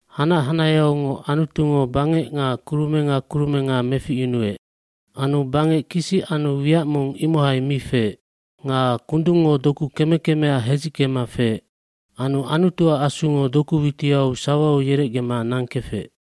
aHanac hanaheaungoc Anutungo bangec nga kurumenga kurumenga meficyunuec. bAnu bangec kisic anu wiac mong imohai mi feec. Nga kundungngo doku keme kemea hedzickema feec. Anu Anutuac Asungo doku witiau sawau yerecgema nangkefec.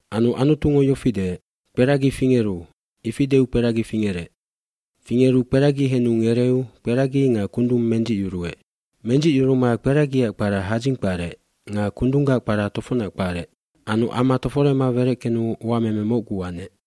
cAnu Anutungo yofi deec, “Kperagi fingeru.” Ifi deu kperagi fingerec. Fingeru kperagi henu ngereu kperagi nga kundung mendzicyuruec. Mendzicyuruma kperagiac kpara hadzing kparec nga kundunggac kpara tofocnac kparec. Anu ama toforema wereckenu uameme mocgu anec.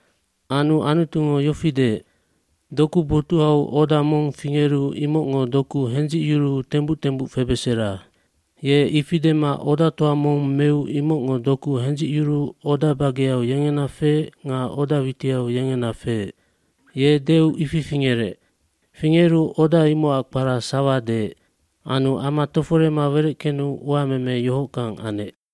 dAnu Anutungo yofi deec, “Doku botuhau oda mong fingeru imocngo doku hendzicyuruu tembuc tembuc febesera.” eYe ifi dema odatoa mong meu imocngo doku hendzicyuruu oda bageau yengena feec nga oda witiau yengena feec. Ye deu ifi fingerec. Fingeru oda imocac kpara sawa deec. Anu ama toforema wereckenu uameme yohockang anec.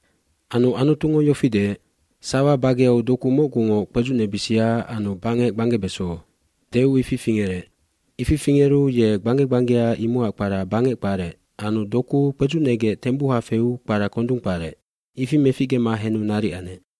fAnu Anutungo yofi deec, “Sawa bageau doku mocgungoc kpedzucnebisia anu bangec gbanggebeso.” Deu ifi fingerec. Ifi fingeru ye gbangge gbanggea imocac kpara bangec kparec anu doku kpedzucnegec tembuha feu kpara kondung kparec. Ifi meficgema henu naric anec.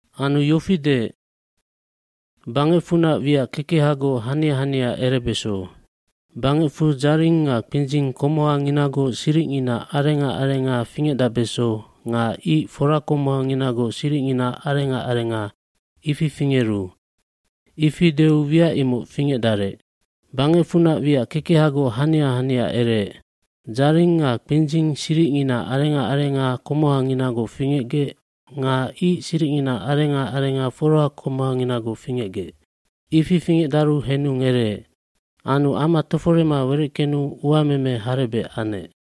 Anu yofi deec, “Bangecfunac wiac kekehagoc hania hania erebeso. Bangecfu dzaring nga kpindzing komohanginagoc siricngina arenga arenga fingecdacbeso nga ic forakomohanginagoc siricngina arenga arenga, ifi fingeru.” Ifi deu wiac imoc fingecdarec. Bangecfunac wiac kekehagoc hania hania ereec. Dzaring nga kpidzing siricngina arenga arenga komohanginagoc fingecgec nga ic siricngina arenga arenga forakomohanginagoc fingecgec. Ifi fingecdaru henu ngereec. Anu ama toforema wereckenu uameme harebec anec.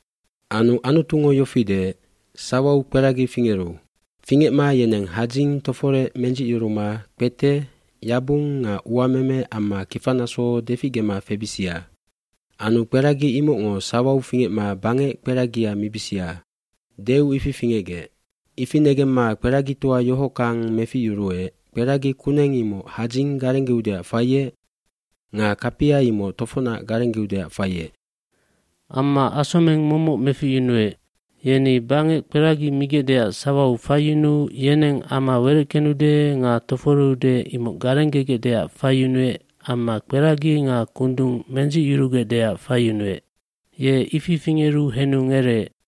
gAnu Anutungo yofi deec, “Sawau kperagi fingeru. Fingecma yeneng hadzing toforec mendzicyuruma kpete yabung nga uameme amma kifanaso deficgema febisia. Anu kperagi imocngo sawau fingecma bangec kperagia mibisia.” Deu ifi fingecgec. hIfi negemma kperagitoa yohockang meficyuruec, kperagi kuneng imoc hadzing garenggeudeac faiec nga kapia imoc tofocnac garenggeudeac faiec. Amma asomeng momoc meficyunuec. Yeni bangec kperagi migecdeac sawau faiyunuu yeneng ama wereckenude nga toforeude imoc garenggegecdeac faiyunuec amma kperagi nga kundung mendzicyurugecdeac faiyunuec. Ye ifi fingeru henu ngereec.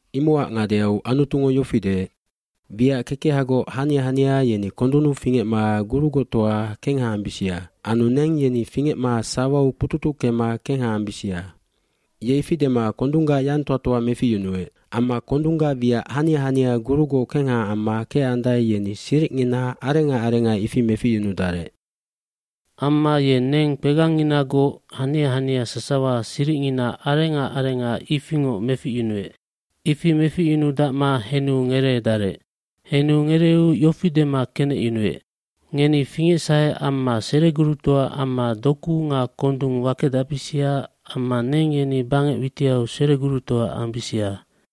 Imocac ngadeau Anutungo yofi deec, “Wiac kekehagoc hania hania yeni kondunnu fingecma gurugoctoa kengha ambisia. Anu neng yeni fingecma sawau kpututuckema kengha ambisia.” Ye ifi dema kondunggac yangtoa toa meficyunuec. Amma kondunggac wiac hania hania gurugoc kengha amma kecandae yeni siricngina arenga arenga ifi meficyunudarec. Amma ye neng kpegangnginagoc hania hania sasawa siricngina arenga arenga ifingoc meficyunuec. Ifi meficyunudacma henu ngereedarec. Henu ngereu yofi dema kenecyunuec, “Ngeni fingecsahe amma seregurutoa amma doku nga kondung wakedacbisia amma neng yeni bangec witiau seregurutoa ambisia.”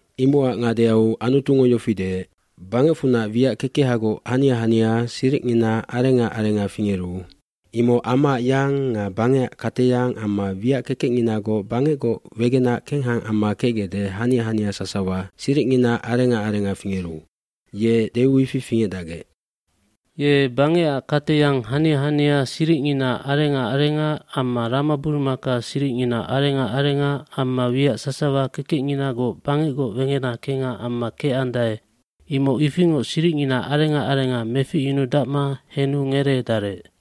Imocac ngadeau Anutungo yofi deec, “Bangecfunac wiac kekehagoc hania hania siricngina arenga arenga fingeru, imoc amaac yang nga bangecac kateyang amma wiac kekecnginagoc bangecgoc wegenac kengha amma kecgecde hania hania sasawa siricngina arenga arenga fingeru.” Ye deu ifi fingecdacgec. Ye bangecac kateyang hania hania siricngina arenga arenga amma ramaburumaka siricngina arenga arenga amma wiac sasawa kekecnginagoc bangecgoc wegenac kengha amma kecandae imoc ifingoc siricngina arenga arenga meficyunudacma henu ngereedarec.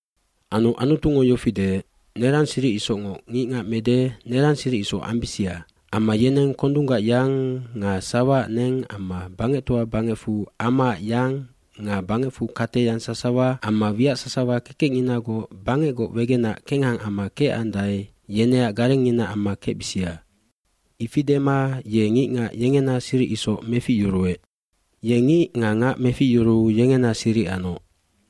jAnu Anutungo yofi deec, “Nerangi siric isocngoc ngicngac mede nerang siric isoc ambisia. Amma yeneng kondunggac yang nga sawaac neng amma bangectoa bangecfu amaac yang nga bangecfu kateyang sasawa amma wiac sasawa kekecnginagoc bangecgoc wegenac kengha amma kecandae yeneac garengngina amma kecbisia.” k lIfi dema ye ngicngac yengena siric isoc meficyuruec. Ye ngic nga ngac meficyuruu yengena siric anoc.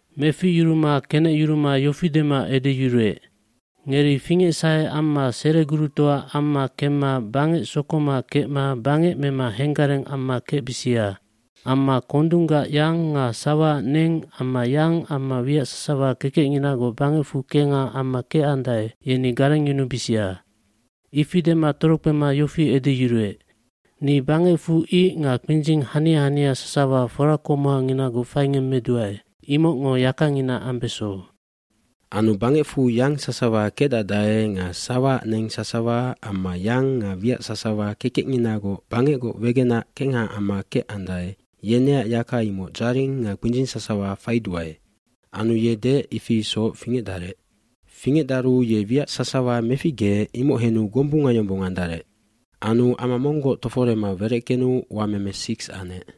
Meficyuruma kenecyuruma yofi dema edeyuruec, “Ngeri fingecsahe amma seregurutoa amma kemma bangec sokoma kecma bangec mema henggareng amma kecbisiam amma kondunggac yang nga sawaac neng amma yang amma wiac sasawa kekecnginagoc bangecfu kengha amma kecandae yeni garengyunubisia.” Ifi dema torokpema yofi edeyuruec, “Ni bangecfu ic nga kpindzing hania hania sasawa forakomohanginagoc faingemmeduae imocngo yakangina ambeso. Anu bangecfu yang sasawa kecdacdae nga sawaac neng sasawa amma yang nga wiac sasawa kekecnginagoc bangecgoc wegenac kengha amma kecdae yeneac yaka imoc dzaring nga kpindzing sasawa faiduae.” Anu ye deec, ifi isoc fingecdarec. Fingecdaru ye wiac sasawa meficgeec imoc henu gombunga yombong andarec. Anu ama monggoc toforema wereckenu uameme siks anec.